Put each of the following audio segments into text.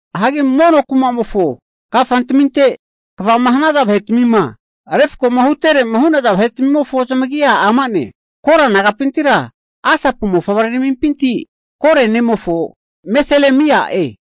Hagi mono kumamofo kafantaminte kvama hanaza vahetamima refkoma huterema hu'naza vahetmimofo zamagia ama'ne, Kora nagapintira Asapu mofavreramimpinti Kore nemofo Meselemia'e.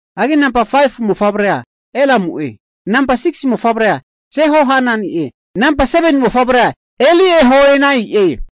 Hagi namba 5fu mofavrea Elamu'e, namba 6si mofavrea Jehohanani'e, namba 7ni mofavrea Eliehoenai'e.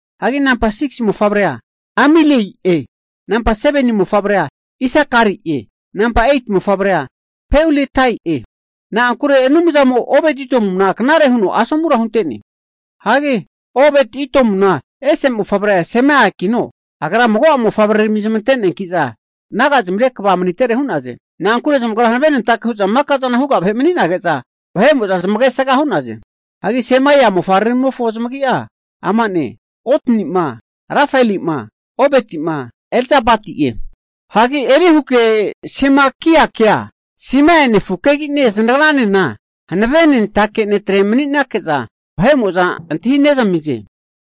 Hagi namba 6si mofavrea Amieli'e, namba 7ni mofavrea Isakari'e, namba 8ti mofavrea Peuletai'e. (Na'ankure Anumzamo'a Obed-Edomuna knare huno asomura hunte'ne.) Hagi Obed-Edomuna ese mofavre'a Semaiakino, agra mago'a mofavrerami zamante'neanki'za naga'zamire kva manitere hu'naze. Na'ankure zamagra hanavenentake hu'za makazana huga vahe mani'nage'za, vahe'mo'za zamagesga hu'naze. Hagi Semaia mofavreramimofo zamagi'a ama'ne, Otni'ma, Refaeli'ma, Obedi'ma, Elzabadi'e. Hagi Elihuke Semakiakea Semaia nefukegine zanagranena hanavenentake netre mani'nake'za antahi nezanamize.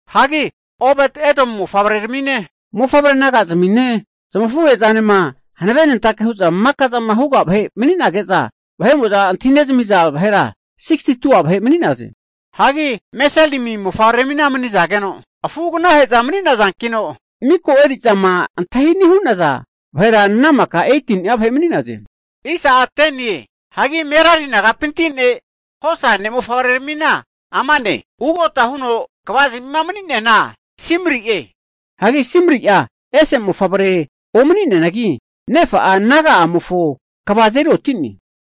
Hagi Obed-Edomu mofavreramine, mofavre naga'zmine zamafuhe'zanena hanavenentake hu'za maka'zana huga vahe mani'nage'za, antahinezamiza vahera 62'a vahe mani'naze. Hagi Meselemi mofavreramina mago'a manizage'za nagazamia mani'nazankino, miko eri'zama antahi ani hu'naza vahera ana makara 18ni'a vahe mani'naze. Hagi Merari nagapinti ne' Hosa ne'mofavreramina amane, ugota huno kvazmima mani'neana Simri'e. Hagi Simri'a ese mofavrea omani'neanagi nefa'a, naga'amofo kva azeri oti'ne.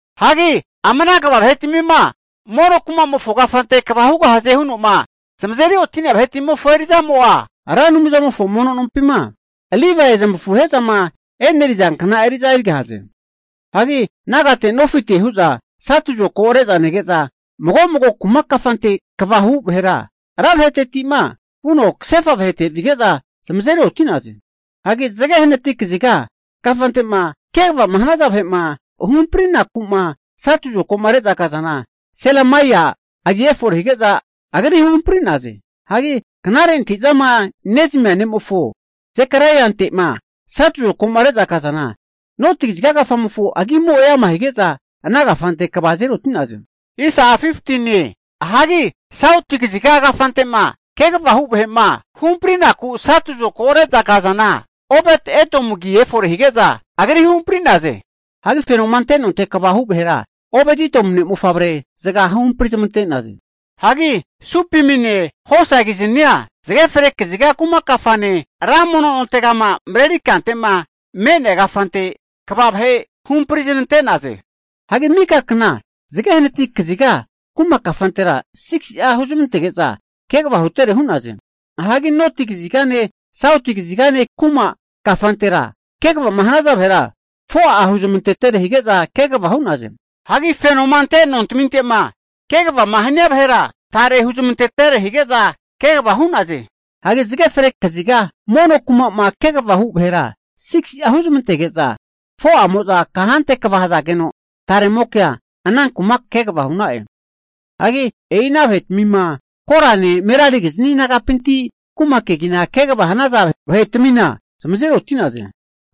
Hagi ama ana kva vahetmima mono kumamofo kafante kva hugahaze huno'ma zamazeri oti'nea vahetmimofo eri'zamo'a, Ra Anumzamofo mono nompima Livae zamafuhe'zama eneriza kna eri'za erigahaze. Hagi nagate nofite hu'za satu zokago re'za nege'za mago mago kuma kafante kvama hu vahera, ra vahetetima vuno kasefa vahete'ma vige'za zamazeri oti'naze. Hagi zage hanati kaziga kafantema kegava hanaza vahe'ma huhamprinaku'ma satu zokago re'za kazana Selemaia agi efore hige'za agri huhampri'naze. Hagi knare antahi'zama nezamia ne'mofo Sekariante'ma satu zokago re'za kazana, noti kaziga kafamofo agimo eama hige'za, ana kafante kva azeri oti'naze. Hagi sauti kaziga kafante'ma kegava hu vahe'ma huhamprinaku satu zokago reza kazana Obed-Edom agi efore hige'za agri huhamprinte'naze. Hagi fenoma ante nonte kva hu vahera Obed-Edomu ne'mofavre zaga huhampri zamante'naze. Hagi Supimine Hosakiznia zage fre kaziga kuma kafane, ra mono nontegama mareri kante'ma me'nea kafante kva vahe huhampriznante'naze. Hagi mika kna zage hanati kaziga kuma kafantera 6si'a huzmantege'za kegava hutere hu'naze. Hagi noti kazigane, sauti kazigane kuma kafantera kegavama hanaza vahera 4'a huzmantetere hige'za kegava hu'naze. Hagi fenoma ante nontaminte'ma, kegava hania vahera tare huzmantetere hige'za kegava hu'naze. Hagi zage fre kaziga mono kuma'ma kegavama hu vahera 6si'a huzmantege'za 4'amo'za kante kva hazageno, tare'mokea ana kuma kegava hu'na'e. Hagi e'i ana vahetamina Korane Merarikizni nagapintintikino kuma kegina kegava hanazana vahetami zamazeri oti'naze.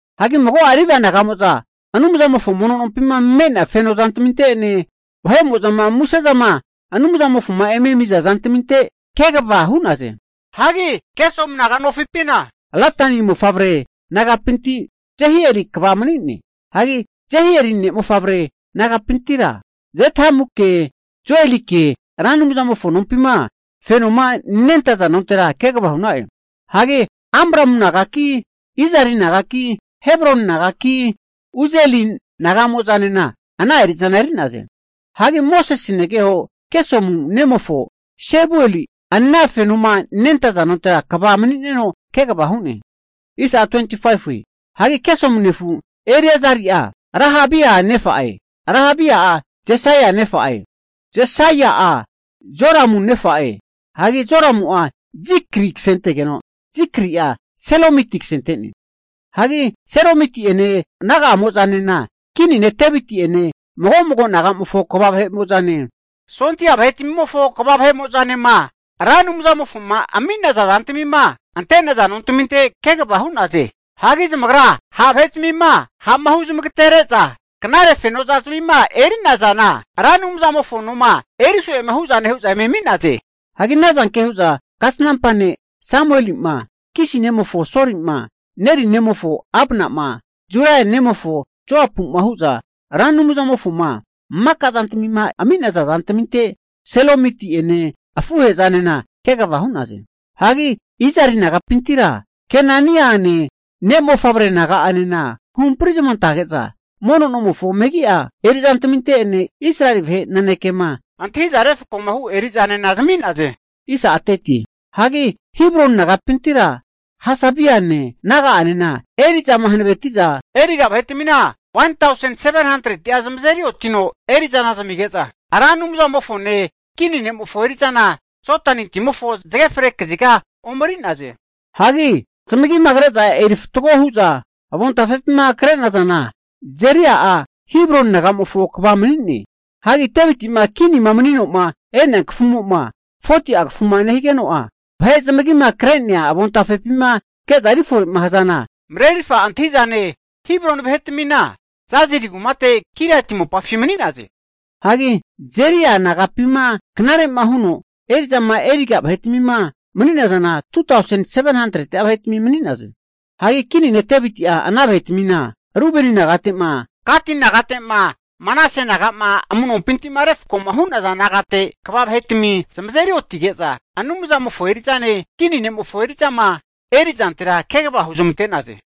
Hagi mago'a Livae naga'mo'za Anumzamofo mono nompima me'nea feno zantaminte'ene vahe'mo'zama musezama Anumzamofoma eme ami'za zantaminte kegava hu'naze. Hagi Gersoni naga'nofipina, Ladani mofavre nagapinti Jehieli kva mani'ne. Hagi Jehieli ne'mofavre nagapintira, Zethamuke, Joelike Ra Anumzamofo nompima fenoma nentaza nontera kegava hu'na'e. Hagi Amramu nagaki, Izari nagaki, Hebroni nagaki, Uzieli naga'mozanena ana eri'zana eri'naze. Hagi Mosese negeho Gesomu nemofo Sebueli ana fenoma nentaza nontera kva mani'neno kegava hu'ne. Hagi Gesomu nefu Eliazari'a Rehabia nefa'e, Rehabia'a Jesaia nefa'e, Jesaia'a Joramu nefa'e hagi Joramu'a Zikri kasentegeno Zikri'a Selomiti kasente'ne. Hagi Seromiti'ene naga'amo'zanena, kini ne' Deviti'ene, mago mago nagamofo kva vahe'mo'zane, sondia vahetmimofo kva vahe'mo'zanema Ra Anumzamofoma ami'naza zantmima ante'naza nontaminte kegava hu'naze. Hagi zamagra ha' vahezmima ha'ma hu zamagatere'za knare fenozmima eri'nazana Ra Anumzamofo noma eriso'ema hu'za kisaza zantami eme ami'naze. Hagi ana zanke hu'za kasnampa ne' Samueli'ma, Kisi nemofo Soli'ma, Neri nemofo Abna'ma, Zeruia nemofo Joapu'ma hu'za Ra Anumzamofoma maka zantmima ami'naza zantminte Salomiti'ene afuhe'zanena kegava hu'naze. Hagi Izari nagapintira Kenaniane ne' mofavre naga'anena huhampri zamantazage'za mono nomofo megia eri'zantminte'ene Israeli vahe nanekema antahiza refkoma hu eri'zanena zami'naze. Hagi Hebroni nagapintira Hasabiane, naga'anena eri'zama hanaveti'za eriga vahetmina 1tausen 700'a zamazeri otino eri'zana zamige'za, Ra Anumzamofone kini ne'mofo eri'zana Jodani timofo zage fre kaziga omeri'naze. Hagi zamagima kre'za eri fatgo hu'za avontafepima krenazana, Jeria'a Hebroni nagamofo kva mani'ne. Hagi Devitima kinima mani'no'ma e'nea kafumo'ma 40'a kafuma nehigeno'a, vahe zamagima kre'nea avontafepima ke'za erifore'ma hazana, marerirfa antahi'zane vahera, Hebroni vahetami Jazeri kumate Giliati mopafi mani'naze. Hagi Jeria nagapima knare'ma huno eri'zama eriga vahetamima mani'nazana, 2tausen 700'a vahetami mani'naze. Hagi kini ne' Deviti'a ana vahetmina Rubeni nagate'ma, Gati nagate'ma Manase nagama amu'nompinti'ma refkoma hu'naza nagate kva vahetami zamazeri otige'za Anumzamofo eri'zane, kini nemofo eri'zama eri'zantera kegava huzmante'naze.